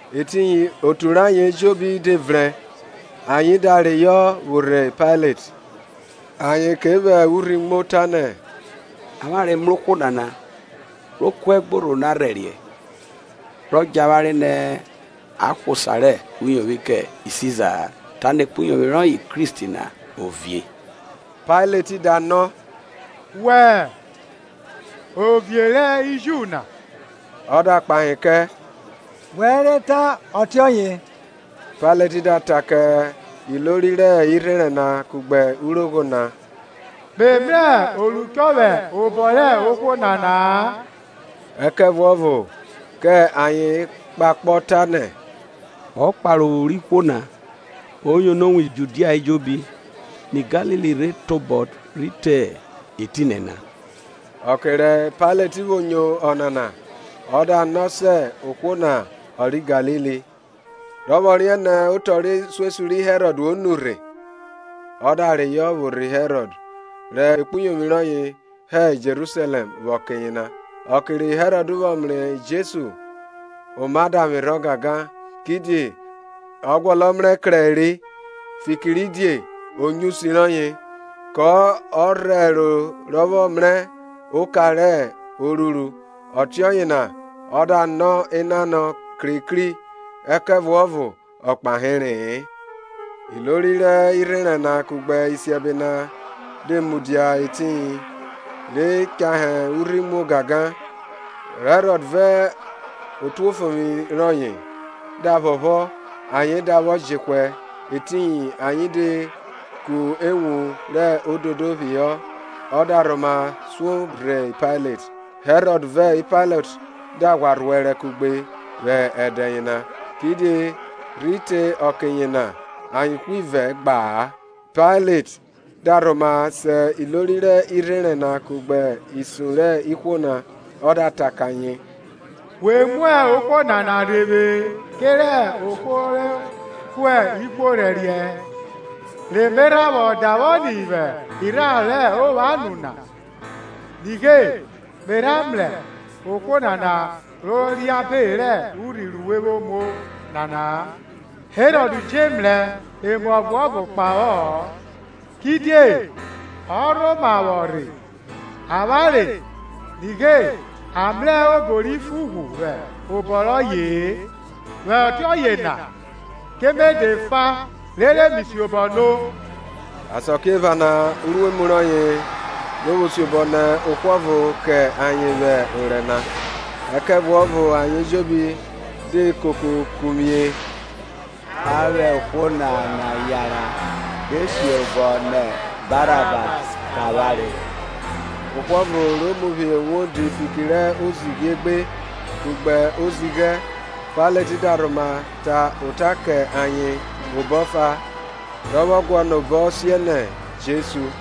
Etiyin Otu rẹ ayen ejobi de vrẹn, ayen da reyọ vwo rhe Pailet. Ayen ke vwẹ urhi muo, tanẹ, Avwanre mrẹ ohwo nana ro kuẹ ẹgborho na rhẹriẹ, rọ djẹ avwanre nẹ a hwa osa rẹ uyovwi kẹ Siza-a, tanẹ ekpuyovwi rọye Kristi na ovie. Pailet da nọ, Wẹ hẹ Ovie ri Ju na? Ọ da kpahe kẹ, Wẹ re ta ọtiọye. Pailet da ta kẹ ilori rẹ irherẹn na kugbe urogho na, Me mrẹ oruchọ vwẹ obọ rẹ ohwo nana-a. Ẹkẹvuọvo kẹ ayen kpakpọ, tanẹ, Ọ kpare ophu rẹ ihwo na, o yono wan Judia ejobi, nẹ Galili rhe tobọ rhi te etinẹ na. Ọke ri Pailet vwo nyo ọnana, ọ da no sẹ ohwo na ọ rẹ Galili. Rọ vwọ riẹn nẹ otọ rhe isuesun ri Herọd o nurhe, ọ da reyọ vwo rhe Herọd, rẹ ekpuyovwi rọye hẹ Jerusalẹm vwẹ ọke yena. Ọke ri Herọd vwọ mrẹ Jesu, oma da vwerhọ gangan, kidie ọ guọnọ mrẹ krẹre, fikiridie o nyo usi rọye, ko rhẹro rọ vwọ mrẹ oka ro ruru. Ọtiọye na ọ da nọ enanọ krekri; ẹkẹvuọvo ọ kpahere. Ilori rẹ irherẹn na kugbe isiẹbe na de mudia etiyin, re chahe urhi muo gangan. Herọd vẹ otuofovwi rọye da phọphọ ayen da vwọ jehwẹ; etiyin, ayen de ku ewun rẹ ododo phihọ, ọ da rhoma suo rhe Pailet. Herọd vẹ Pailet da ghwa rhuẹrẹ kugbe vwẹ ẹdẹ yena, kidie rhi te ọke na ayen ivẹ na gba-a. Pailet da rhoma se ilori rẹ irherẹn na kugbe isun rẹ ihwo na, ọ da ta kẹ ayen We mu ohwo nana rhe vwe kerẹ ohwo ro kuẹ ihwo rhẹriẹ; re me rha vwọ davwọ ni vwẹ irharo rẹ ovwan nu na, nighe, me rha mrẹ ohwo nana rọ reabe rẹ urhi ru we vwo muo naa; Herọd je mrẹ emuọvo kpahọ-ọ, kidie ọ rhoma vwo rhe avwanre, Nighe, a mrẹ obo ri fo ughwu vwẹ obọ rọye-e; vwẹ ọtiọye na ke me de fa rere mi siobọ nọ. Asakiephana uruemu rọye ro vwo siobọ nẹ ohwo ọvo kẹ ayen vwẹ orẹ na. Ẹkẹvuọvo ayen ejobi de koko kuvwie, A vwẹ ohwo nana yanran, re siobọ nẹ Barabas kẹ avwanre– ohwo ọvo re mu phihọ uwodi fiki rẹ ozighi egbe, kugbe ozighẹ. Pailet da rhoma ta ota kẹ ayen obọ ọfa, rọ vwọ guọnọ obọ siẹnẹ Jesu.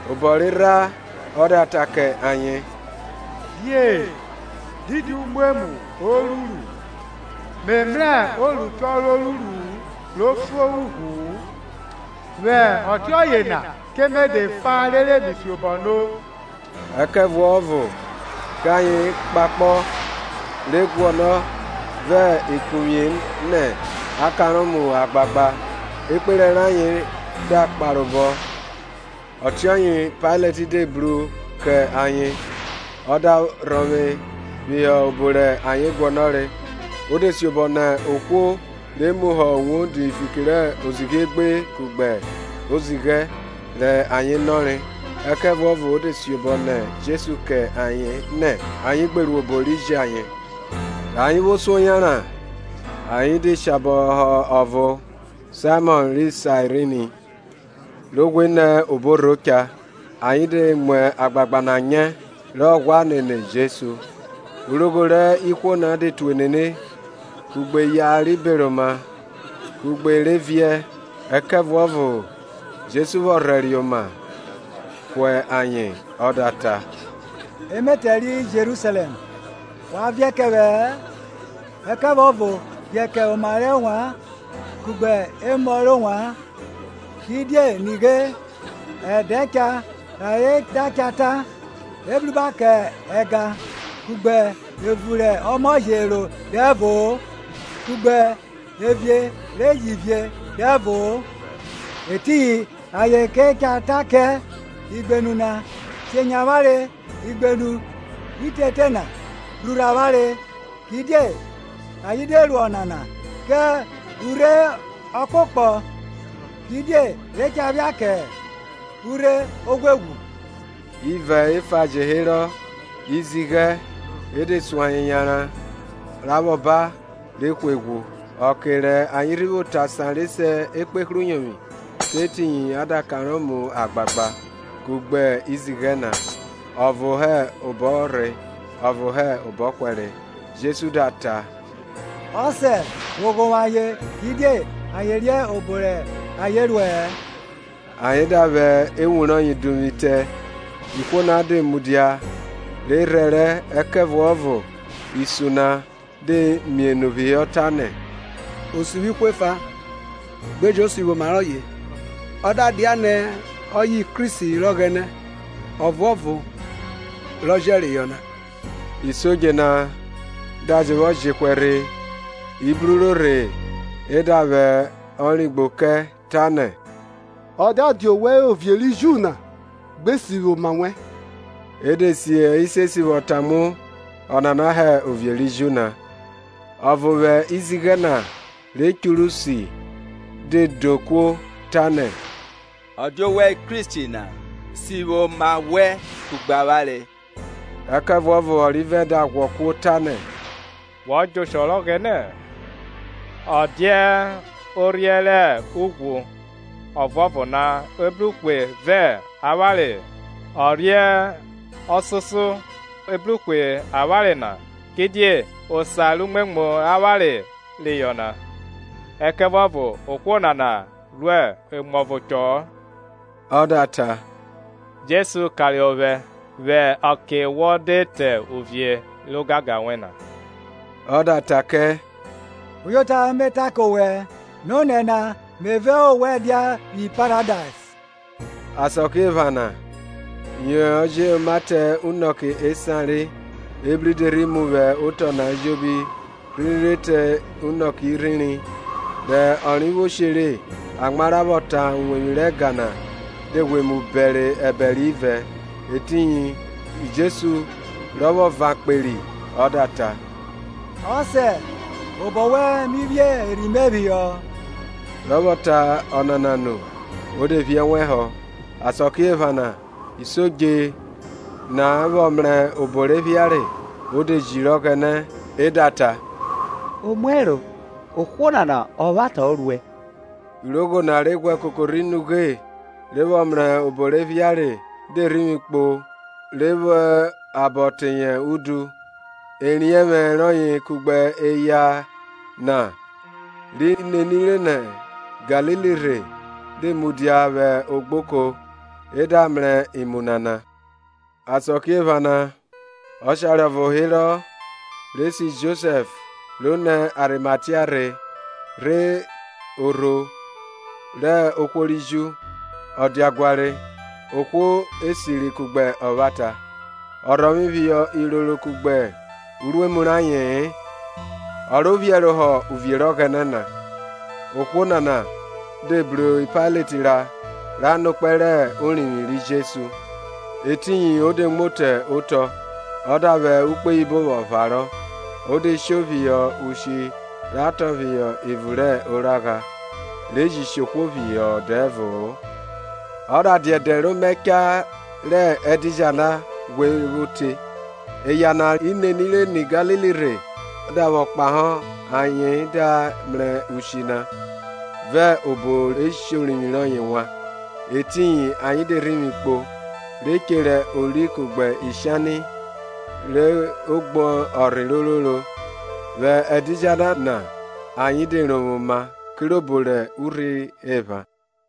Obọ rerha ọ da ta kẹ ayen, Die, didi umwemwu o ruru? Me mrẹ oruchọ ro ruru ro fo ughwu-u, vwẹ ọtiọye na ke me de fa rere mi siobọ no. Ẹkẹvuọvo kẹ ayen kpakpọ, re guọnọ vẹ ekuvwie nẹ ọ kanrọ mu agbagba. Ekperẹ rayen da kparobọ. Ọtiọye Pailet de bru kẹ ayen ọ da rhọvwe phihọ obo rẹ ayen guọnọre. O de siobọ nẹ ohwo re mu họ uwodi fiki rẹ ozighi egbe kugbe ozighẹ, rẹ ayen nọre; ẹkẹvuọvo o de siobọ nẹ Jesu kẹ ayen nẹ ayen gbe ru obo ri je ayen. Rẹ ayen vwo suo yanran, ayen de shabọ họ ọvo Saimọn ri Sairini, ro ghwe nẹ obo orho cha, ayen de mu agbagba na nyẹ, rọ ghwa nene Jesu. Urogho rẹ ihwo na de tue nene, kugbe eya ri beroma kugbe e re viẹ. Ẹkẹvuọvo ri Jesu vwọ rhẹriẹ oma ku ayen ọ da ta, Emetẹ ri Jerusalẹm, wa viẹ kẹ vwẹ-ẹ, ẹkẹvuọvo viẹ kẹ oma rẹ ovwan kugbe emọ rẹ ovwan. Kidie nighe, ẹdẹ cha rẹ ayen da cha ta, Ebruba kẹ ẹga, kugbe evun rẹ ọmọ je ro dẹvo-o, kugbe evie re ji vie dẹvo-o! Etiyin ayen ke cha ta kẹ igbenu na, Shenyẹ avwanre; igbenu itete na, rhurhu avwanre. Kidie ayen de ru ọnana ke urhe ọkpokpọ, kidie re cha phia kẹ urhe oghweghwu? Ivẹ efa je herọ, izighẹ, e de sun ayen yanran ra vwọ ba re hwe ghwu. Ọkẹ rẹ ayen rhi vwo te asan na re se Ekpehruyovwi kẹ etiyin a da kanrọ mu agbagba, kugbe izighẹ na, ọvo hẹ obọrhe ọvo hẹ obọhwẹre. Jesu da ta, Ọsẹ, vwo ghovwo ayen; kidie ayen riẹn obo rẹ ayen ruẹ-ẹ. Ayen da vwẹ ewun rọye vwo duvwu itẹ. Ihwo na de mudia, re rhẹrẹ; ẹkẹvuọvo isun na de mienu phihọ, tanẹ, O sivwi ihwo efa; gbe jẹn o sivwi oma rọye, ọ da dianẹ ọye hẹ Kristi rẹ Ọghẹnẹ, Ọvuọvo rọ Jẹreyọ na. Isodje na da je vwọ jehwẹ rhe, i bruro rhe e da vwẹ origbo kẹ, tanẹ, Ọ da dia owẹ hẹ Ovie ri Ju na, gbe sivwi oma wẹn! E de si isiesi vwọ tamuo, Ọnana hẹ Ovie ri Ju na. Ọvo vwẹ izighẹ na re churu si de do kuo, tanẹ, Ọ dia owẹ hẹ Kristi na? Sivwi oma wẹn kugbe avwanre! Ẹkẹvuọvo ọrivẹ da ghwọ kuo, tanẹ, Wọ djẹ oshọ rẹ Ọghẹnẹ-ẹ, ọ dia orhiẹ rẹ ughwu ọvuọvo na e bru hwe vẹ avwanre-e? Orhie ọsoso e bru hwe avwanre na; kidie osa rẹ umwemwu avwanre reyọ na; ẹkẹvuọvo ohwo nana ru emuọvo chọ-ọ. Ọ da ta, Jesu karohọ ovwẹ vwẹ ọke wo de te uvie rẹ ogangan wẹn na. Ọ da ta kẹ, Uyota me ta kẹ owẹ, nonẹ na me vẹ owẹ dia vwi Paradais. Asakiephana yọ jẹ oma te unọke esan re, ebri de rhi mu vwẹ otọ na ejobi rhiri rhi te unọke irhiri, Rẹ ọnre vwo she re; amwa ra vwọ tan uwevwi rẹ ẹga na de mu bẹre ẹbẹre ivẹ. Etiyin Jesu, rọ vwọ van kperi, ọ da ta, Ọsẹ, obọ wẹn mi phi erhi mẹ phihọ! Rọ vwọ ta ọnana nu o de phi ẹnwẹ họ. Asakiephana rẹ isodje na vwọ mrẹ obo re phiare, o de jiri Ọghẹnẹ, ẹ da ta, Omuẹro, ohwo nana ọvwata ọ ruẹ! Urogho na re ghwẹ koko rhi ni ughe, re vwọ mrẹ obo re phiare de rhivwi kpo re vwẹ abọ teye udu. Eriẹnvwẹ rọye kugbe eya na ri nenire nẹ Galili rhe de mudia vwẹ ogboko e da mrẹ imu nana. Asakiephana ọshare ọvo herọ re se Josẹf ro nẹ Arimatia rhe rhe orho rẹ ihwo ri Ju. Ọdiaguare, ohwo esiri kugbe ọvwata, ọ rhọvwe phihọ iroro kugbe uruemu raye-en, o ro phiẹrohọ uvie rẹ Ọghẹnẹ na. Ohwo nana de bru Pailet ra ra nọ ekpẹn rẹ orivwi ri Jesu. Etiyin o de muo te otọ ọ da vwẹ ukpoyibo vwọ pharọ, o de sho phihọ ushi ta tọn phihọ evun rẹ oragha, re ji shi ohwo phihọ dẹvo-o. Ọ da dia ẹdẹ rẹ Omaẹcha, yẹ ẹdidjala ghwe ro te. Eya na ri nenire nẹ Galili rhe da vwọ kpahọ, ayen da mrẹ ushi na, vẹ obo re shi orivwi rọye wan; Etiyin ayen de rhivwi kpo, re chere ori kugbe ishani ri gbo ọnrhe ororo. Vwẹ ẹdidjala na ayen de rovwoma kirobo rẹ urhi epha.